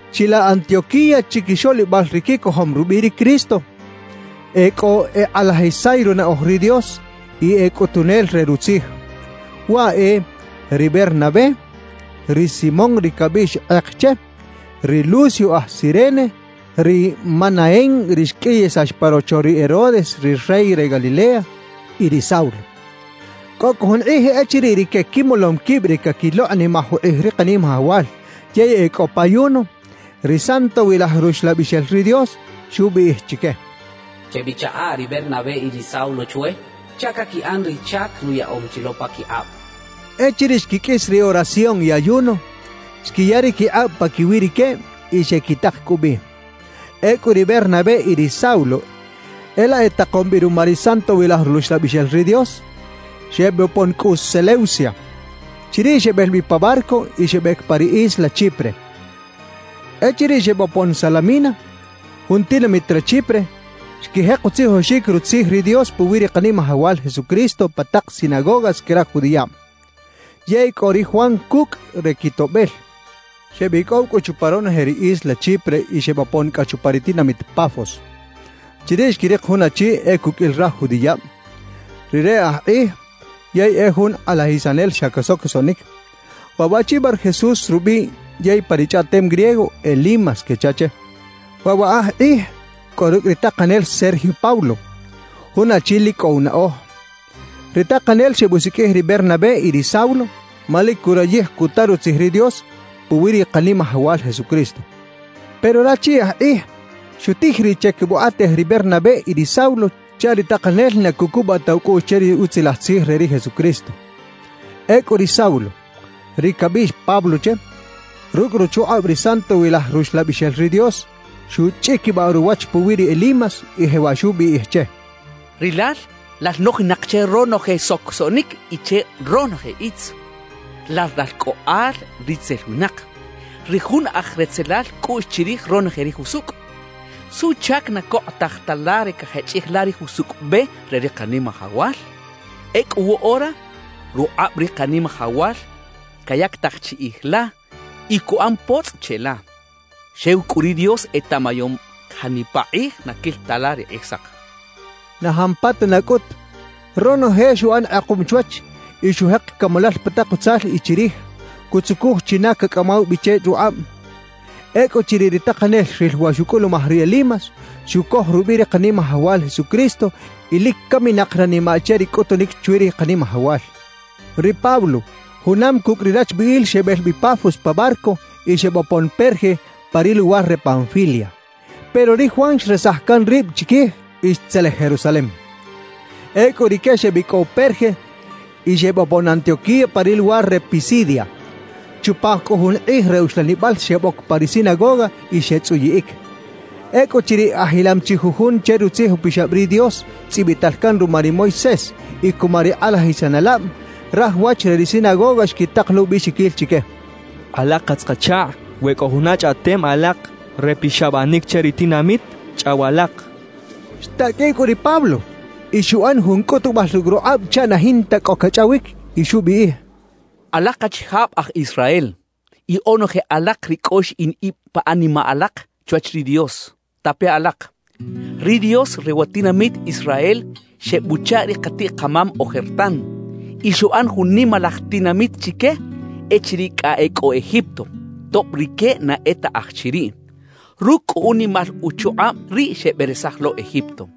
Chilaꞌ Antioquía chiquixoꞌlibal ri quicojom rubiꞌ ri Cristo, e cꞌo ekꞌalajisay runaꞌoj ri Dios y e cꞌutunel re Rutzij. Waꞌ e: ri Bernabé, ri Simón ri cabiꞌx kꞌek che, ri Lucio aj Cirene, ri Manaén ri xqꞌuiyisax pa rocho ri Herodes ri rey re Galilea y ri Saulo. Cꞌo cꞌu jun kꞌij echiriꞌ rique quimolom quib re caquilokꞌnimaj ukꞌij ri Kanimajawal yey e cꞌo pa ayuno, ri Santowilaj Ruxlabixel ri Dios xubiꞌij chique: «Chebichaꞌa ri Bernabé y ri Saulo chwe chaꞌ caquiꞌan ri chac nuyaꞌom chi lo paquikꞌab» xchaꞌ. Echiriꞌ xquiqꞌuis ri oración y ayuno, xquiya ri quikꞌab paquiwi rique y xequitak cꞌu bi. Ecꞌu ri Bernabé y ri Saulo e laꞌ etakom bi ruma ri Santowilaj Ruxlabixel ri Dios, xebopon cꞌu Seleucia. Chiriꞌ xebel bi pa barco y xebec pa ri isla Chipre. Echiriꞌ xebopon Salamina, jun tinamit re Chipre, xquijek utzijoxic Rutzij ri Dios puwi ri Kanimajawal Jesucristo pa tak sinagogas que raj judiꞌab. Yey cꞌo ri Juan cucꞌ re quitoꞌbel. Xebicꞌow cꞌu chupa ronoje ri isla Chipre y xebopon cꞌa chupa ri tinamit Pafos. Chiriꞌ xquirik jun achi e cuqꞌuil raj judiꞌab; rire aj kꞌij yey e jun kꞌalajisanel xa casocosoꞌnic. Waꞌ waꞌchi Barjesús rubiꞌ, yey pa ri chꞌaꞌtem griego “Elimas” quecha che. Waꞌ wa aj kꞌij cꞌo rucꞌ ri takanel Sergio Paulo, jun achi lic cꞌo unaꞌoj. Ri takanel xebusiqꞌuij ri Bernabé y ri Saulo, ma lic curayij cuta Rutzij ri Dios puwi ri Kanimajawal Jesucristo. Pero rachi aj kꞌij xutij riꞌ che quebukꞌatej ri Bernabé y ri Saulo chaꞌ ri takanel na cucubaꞌ ta ucꞌuꞌx che ri Utzilaj Tzij re ri Jesucristo. Ecꞌu ri Saulo (ri cabiꞌx Pablo che) rucꞌ ruchukꞌab ri Santowilaj Ruxlabixel ri Dios xuchꞌiquibaꞌ ruwach puwi ri Elimas, y jewaꞌ xubiꞌij che: «¡Rilal lal nojinak che ronoje socosoꞌnic y che ronoje itz! ¡Lal ralcꞌoꞌal ritzel winak, ri jun aj retzelal cꞌuꞌx chirij ronoje ri jusucꞌ! ¿Suꞌchac na cokꞌotaj ta la ri cajechꞌij la ri jusucꞌ be re ri Kanimajawal? Ecꞌu woꞌora rukꞌab ri Kanimajawal cayactaj chiꞌij la y cuꞌan potzꞌ cheꞌla; xew cꞌu ri Dios etaꞌmayom janipa kꞌij na quil ta la ri kꞌijsak» xchaꞌ. Na jampatana cꞌut ronoje xuꞌan kꞌekuꞌm chwach y xujek camalal pa tak utzal y chirij, cutzucuj china cacꞌamaw bi che rukꞌab. Ecꞌuchiriꞌ ri takanel xril wa xucꞌulumaj ri Elimas, xucoj rubiꞌ ri Kanimajawal Jesucristo, y lic caminak ranimaꞌ che ri cꞌutunic chwi ri Kanimajawal. Ri Pablo junam cucꞌ ri rachbiꞌil xebel bi Pafos pa barco y xebopon Perge pa ri luwar re Panfilia. Pero ri Juan xresaj can rib chiquij y xtzelej Jerusalem. Ecꞌu rique xebicꞌow Perge y xebopon Antioquía pa ri luwar re Pisidia. Chupa cꞌu jun kꞌij re uxlanibal xeboc pa ri sinagoga y xetzꞌuyiꞌic. Ecꞌuchiriꞌ ajilam chi jujun che Rutzij Upixab ri Dios tzꞌibital can ruma ri Moisés y cuma ri kꞌalajisanelab, raj wach re ri sinagoga xquitak lo ubiꞌxiquil chique: «Alak katz-kachakꞌ, we cꞌo juna chꞌaꞌtem alak re pixabanic che ri tinamit, chꞌaw alak» xechaꞌ. Xtaqꞌuiꞌ cꞌu ri Pablo y xuꞌan jun cꞌutubal rucꞌ rukꞌab chaꞌ na jinta cꞌo cachꞌawic y xubiꞌij: «Alak achijab aj Israel y onoje alak ri cꞌo xiꞌin ib pa animaꞌ alak chwach ri Dios, tape alak. Ri Dios re wa tinamit Israel xebuchaꞌ ri katiꞌ-kamam ojertan y xuꞌan jun nimalaj tinamit chique echiriꞌ cꞌa e cꞌo Egipto, tob rique na e ta aj chiriꞌ. Rucꞌ cꞌu unimal uchukꞌab riꞌ xeberesaj lo Egipto.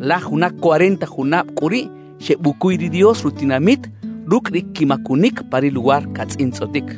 »Laj juna cuarenta junab cꞌu riꞌ xebucuy ri Dios rutinamit rucꞌ ri quimacunic pa ri luwar catzꞌintzꞌotic.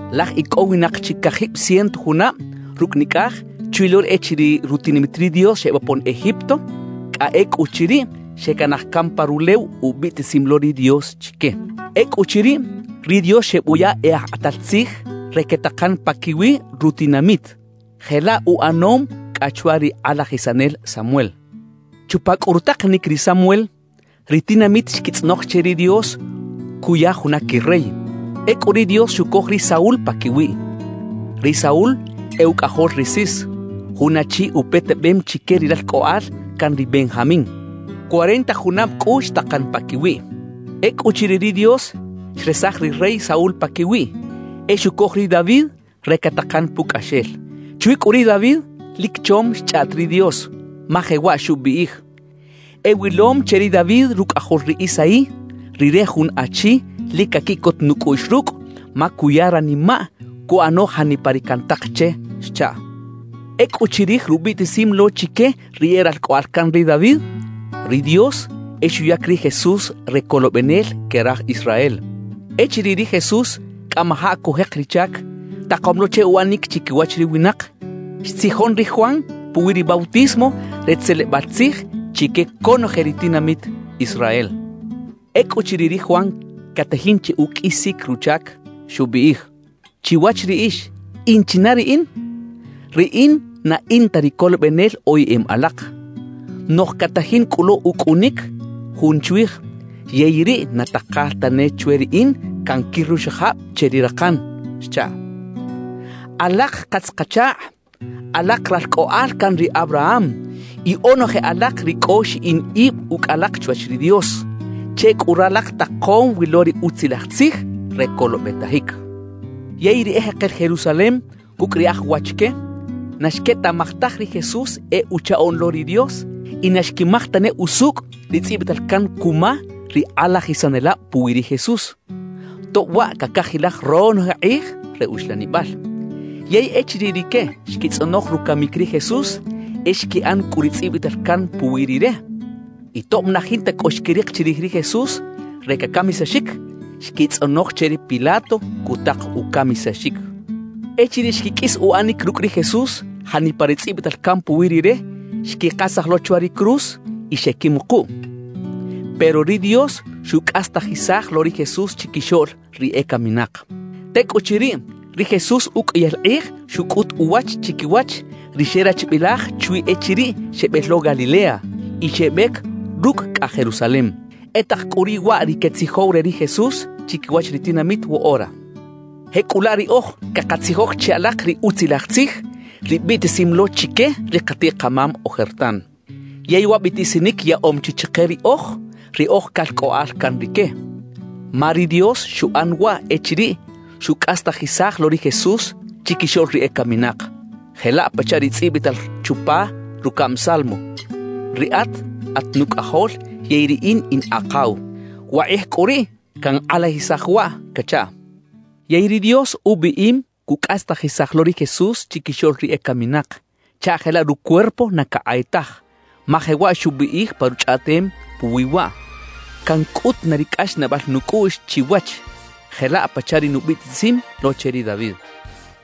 Laj icꞌowinak chi cajib ciento junab rucꞌ nicꞌaj chwi lo echiriꞌ rutinamit ri Dios xebopon Egipto, cꞌa ecꞌuchiriꞌ xecanaj can pa rulew ubiꞌtisim lo ri Dios chique. »Ecꞌuchiriꞌ, ri Dios xebuya e aj kꞌatal tzij re quetakan paquiwi rutinamit. Jelaꞌ uꞌanom cꞌa chwa ri kꞌalajisanel Samuel. Chupa cꞌu rutakanic ri Samuel, ri tinamit xquitzꞌonoj che ri Dios cuya juna quirey. Ecꞌu ri Dios xucoj ri Saúl paquiwiꞌ. Ri Saúl e ucꞌajol ri Cis, jun achi upetebem chique ri ralcꞌoꞌal can ri Benjamín. Cuarenta junab cꞌu xtakan paquiwiꞌ. Ecꞌuchiriꞌ ri Dios xresaj ri rey Saúl paquiwiꞌ, e xucoj ri David re catakan pucꞌaxel. Chwi cꞌu ri David lic chom xchꞌaꞌt ri Dios, ma jewaꞌ xubiꞌij: E wilom che ri David rucꞌajol ri Isaí, rire jun achi lic caquiꞌcot nucꞌuꞌx rucꞌ ma cuya ranimaꞌ cuꞌano janipa ri cantak che xchaꞌ. »Ecꞌu chirij rubiꞌtisim lo chique ri e ralcꞌoꞌal can ri David, ri Dios e xuyac ri Jesús re Colobenel que raj Israel. Echiriꞌ ri Jesús cꞌamajaꞌ cujek ri chac takom lo che uꞌanic chiquiwach ri winak, xtzijon ri Juan puwi ri bautismo re tzelebal tzij chique conoje ri tinamit Israel. Ecꞌuchiriꞌ ri Juan catajin che uqꞌuisic ruchac, xubiꞌij: “Chiwach riꞌix ¿in china riꞌin? Riꞌin na in ta ri Colobenel oyeꞌem alak. Noꞌj catajin cꞌu lo ucꞌunic Jun chwij, yey riꞌ na takal tane chwe riꞌin canquir ruxajab che ri rakan” xchaꞌ. »Alak katz-kachakꞌ, alak ralcꞌoꞌal can ri Abraham y onoje alak ri cꞌo xiꞌin ib ucꞌ alak chwach ri Dios, che cꞌu ralak takom wi lo ri Utzilaj Tzij re colobetajic. Yey ri ejekel Jerusalem cucꞌ ri e aj wach que, na xquetaꞌmaj taj ri Jesús e Uchaꞌoꞌn lo ri Dios y na xquimaj tane usucꞌ ri tzꞌibital can cuma ri kꞌalajisanelab puwi ri Jesús, tob waꞌ cacajilaj ronoje kꞌij re uxlanibal. Yey echiriꞌ rique xquitzꞌonoj rucamic ri Jesús, e xquiꞌan cꞌu ri tzꞌibital can puwi Rire. Y tob na jinta cꞌo xquirik chirij ri Jesús re cacamisaxic, xquitzꞌonoj che ri Pilato cutak ucamisaxic. Echiriꞌ xquiqꞌuis uꞌanic rucꞌ ri Jesús janipa ri tzꞌibital can puwi Rire, xquikasaj lo chwa ri cruz y xeꞌquimukuꞌ. »Pero ri Dios xucꞌastajisaj lo ri Jesús chiquixoꞌl ri ecaminak. Tecꞌuchiriꞌ, ri Jesús uqꞌuiyal kꞌij xucꞌut uwach chiquiwach ri xerachbilaj chwi echiriꞌ xebel lo Galilea y xebec rucꞌ cꞌa Jerusalem. E tak cꞌu riꞌ waꞌ ri quetzijow re ri Jesús chiquiwach ri tinamit woꞌora. »Jecꞌulaꞌ riꞌoj cakatzijoj che alak ri Utzilaj Tzij, ri biꞌtisim lo chique ri katiꞌ-kamam ojertan. Yey wa biꞌtisinic yaꞌom chi chike riꞌoj ri oj calcꞌoꞌal can rique. Ma ri Dios xuꞌan waꞌ echiriꞌ xucꞌastajisaj lo ri Jesús chiquixoꞌl ri ecaminak, jelaꞌ pachaꞌ ri tzꞌibital chupa rucaꞌm Salmo: Riꞌat at Nucꞌajol yey Riꞌin in Akaw; wakꞌij cꞌu riꞌ cankꞌalajisaj waꞌ cachaꞌ. »Yey ri Dios ubiꞌim cucꞌastajisaj lo ri Jesús chiquixoꞌl ri ecaminak chaꞌ jelaꞌ rucuerpo na cakꞌay taj, ma jewaꞌ xubiꞌij pa Ruchꞌaꞌtem puwi waꞌ: Cancꞌut na ri cꞌaxnaꞌbal nucꞌuꞌx chiwach, jelaꞌ pachaꞌ ri nubiꞌtisim lo che ri David.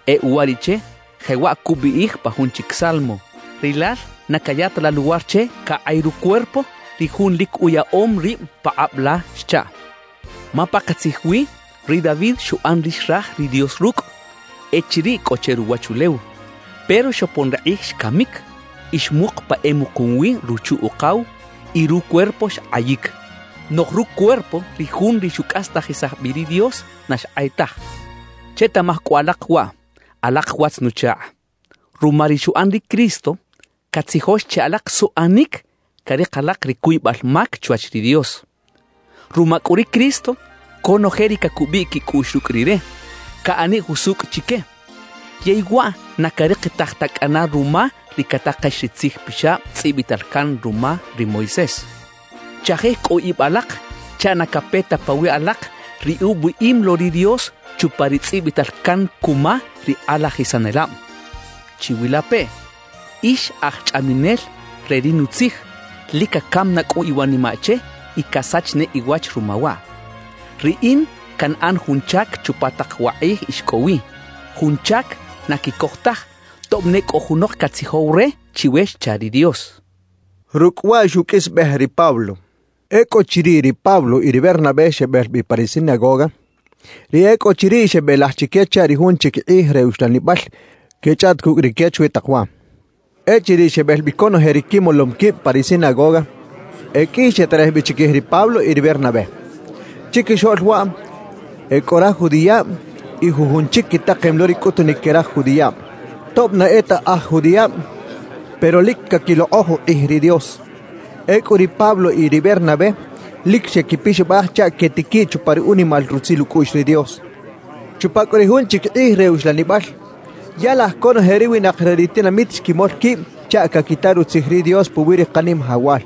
E uwariꞌche jewaꞌ cubiꞌij pa jun chic Salmo: Rilal na caya ta la luwar che cakꞌay rucuerpo ri Jun lic uyaꞌom rib pakꞌab la xchaꞌ. »Ma pakatzij wi ri David xuꞌan ri xraj ri Dios rucꞌ echiriꞌ cꞌo che ruwachulew, pero xopon ri kꞌij xcamic y xmuk pa emukum wi ruchu-ukaw, y rucuerpo xkꞌayic. Noꞌj rucuerpo ri Jun ri xucꞌastajisaj bi ri Dios, na xkꞌay taj. »Chetaꞌmaj cꞌu alak waꞌ, alak watz-nuchakꞌ: Ruma ri xuꞌan ri Cristo, catzijox che alak suꞌanic carik alak ri cuybal mac chwach ri Dios. Ruma cꞌu ri Cristo, conoje ri cacubiꞌ quicꞌuꞌx rucꞌ Rire, caꞌaniꞌ jusucꞌ chique. Yey waꞌ na carikitaj ta cꞌana ruma ri catakex ri Tzij Pixab tzꞌibital can ruma ri Moisés. »Chajij cꞌu ib alak chaꞌ na cape ta pawiꞌ alak ri ubiꞌim lo ri Dios chupa ri tzꞌibital can cuma ri kꞌalajisanelab: Chiwilapeꞌ, ix aj chꞌaminel re ri Nutzij, lic cacam na cꞌu iwanimaꞌ che y casach ne iwach ruma waꞌ: Riꞌin canꞌan jun chac chupa tak wa kꞌij ix cꞌo wi, jun chac na quicoj taj, tob ne cꞌo junok catzijow re chiwe xcha ri Dios.» Rucꞌ waꞌ xuqꞌuisbej ri Pablo. Ecꞌuchiriꞌ ri Pablo y ri Bernabé xebel bi pa ri sinagoga, ri e cꞌo chiriꞌ xebelaj chique chaꞌ ri jun chic kꞌij re uxlanibal quechꞌaꞌt cucꞌ rique chwi tak waꞌ. Echiriꞌ xebel bi conoje ri quimolom quib pa ri sinagoga, e qꞌui xeterej bi chiquij ri Pablo y ri Bernabé. Chiquixoꞌl waꞌ e cꞌo raj judiꞌab y jujun chic quitakem lo ri cꞌutunic que raj judiꞌab (tob na e ta aj judiꞌab, pero lic caquilokꞌoj ukꞌij ri Dios). Ecꞌu ri Pablo y ri Bernabé lic xequipixabaj chaꞌ quetiquiꞌ chupa ri unimal rutzil ucꞌuꞌx ri Dios. Chupa cꞌu ri jun chic kꞌij re uxlanibal, ya laj conoje ri winak re ri tinamit xquimol quib chaꞌ caquita Rutzij ri Dios puwi ri Kanimajawal.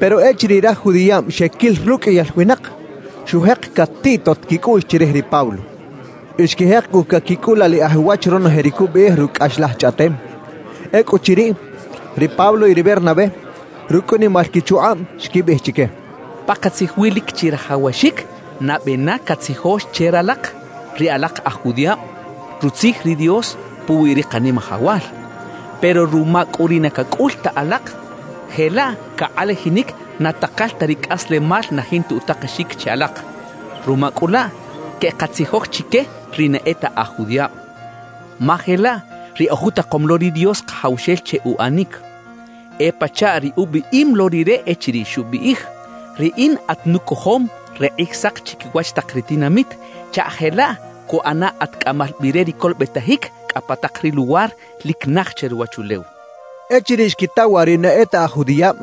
Pero echiriꞌ raj judiꞌab xequil ruqꞌuiyal winak, xujek catiꞌtot quicꞌuꞌx chirij ri Pablo. Y xquijek cꞌu caquicꞌulaliꞌaj uwach ronoje ri cubiꞌij rucꞌ cꞌaxlaj chꞌaꞌtem. Ecꞌuchiriꞌ, ri Pablo y ri Bernabé, rucꞌ unimal quichukꞌab, xquibiꞌij chique: —Pakatzij wi lic chirajawaxic nabe na catzijox che ralak ri alak aj judiꞌab Rutzij ri Dios puwi ri Kanimajawal. Pero ruma cꞌu ri na cacꞌul ta alak, jelaꞌ cakꞌalajinic na takal ta ri cꞌaslemal na jinta utakexic che alak. Ruma cꞌu laꞌ queꞌkatzijoj chique ri na e ta aj judiꞌab, ma jelaꞌ ri ojutakom lo ri Dios Kajawxel che uꞌanic. E pachaꞌ ri ubiꞌim lo Rire echiriꞌ xubiꞌij: Riꞌin atnucojom re Kꞌijsak chiquiwach tak ri tinamit chaꞌ jelaꞌ cuꞌana at cꞌamal bi re ri colobetajic cꞌa pa tak ri luwar lic naj che ruwachulew —xechaꞌ. Echiriꞌ xquita waꞌ ri na e ta aj judiꞌab,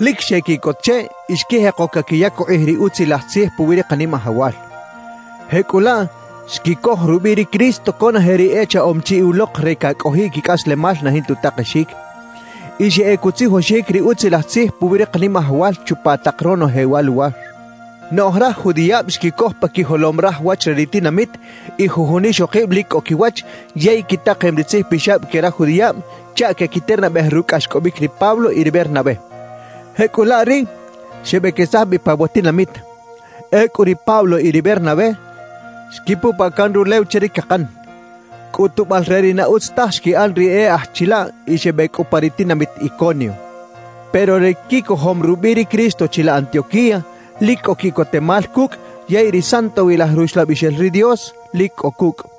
lic xequiꞌcot che y xquijeko caquiyac ukꞌij ri Utzilaj Tzij puwi ri Kanimajawal. Jecꞌulaꞌ xquicoj rubiꞌ ri Cristo conoje ri echaꞌom chi ulok re cacꞌojiꞌ quicꞌaslemal na jinta utakexic. Y xeꞌec utzijoxic ri Utzilaj Tzij puwi ri Kanimajawal chupa tak ronoje wa luwar. Noꞌj raj judiꞌab xquicoj pa quijolom raj wach re ri tinamit y jujun ixokib lic cꞌo quiwach yey quitakem ri tzijpixab que raj judiꞌab, chaꞌ quequiternabej rucꞌ cꞌaxcꞌobic ri Pablo y ri Bernabé. Jecꞌulaꞌ riꞌ xebequesaj bi pa wa tinamit. Ecꞌu ri Pablo y ri Bernabé xquipupaꞌ can rulew che ri cakan, cꞌutubal re ri na utz taj xquiꞌan ri e aj chilaꞌ y xebec cꞌu pa ri tinamit Iconio. Pero ri quicojom rubiꞌ ri Cristo chilaꞌ Antioquía lic cꞌo quiꞌcotemal cucꞌ yey ri Santowilaj Ruxlabixel ri Dios lic cꞌo cucꞌ.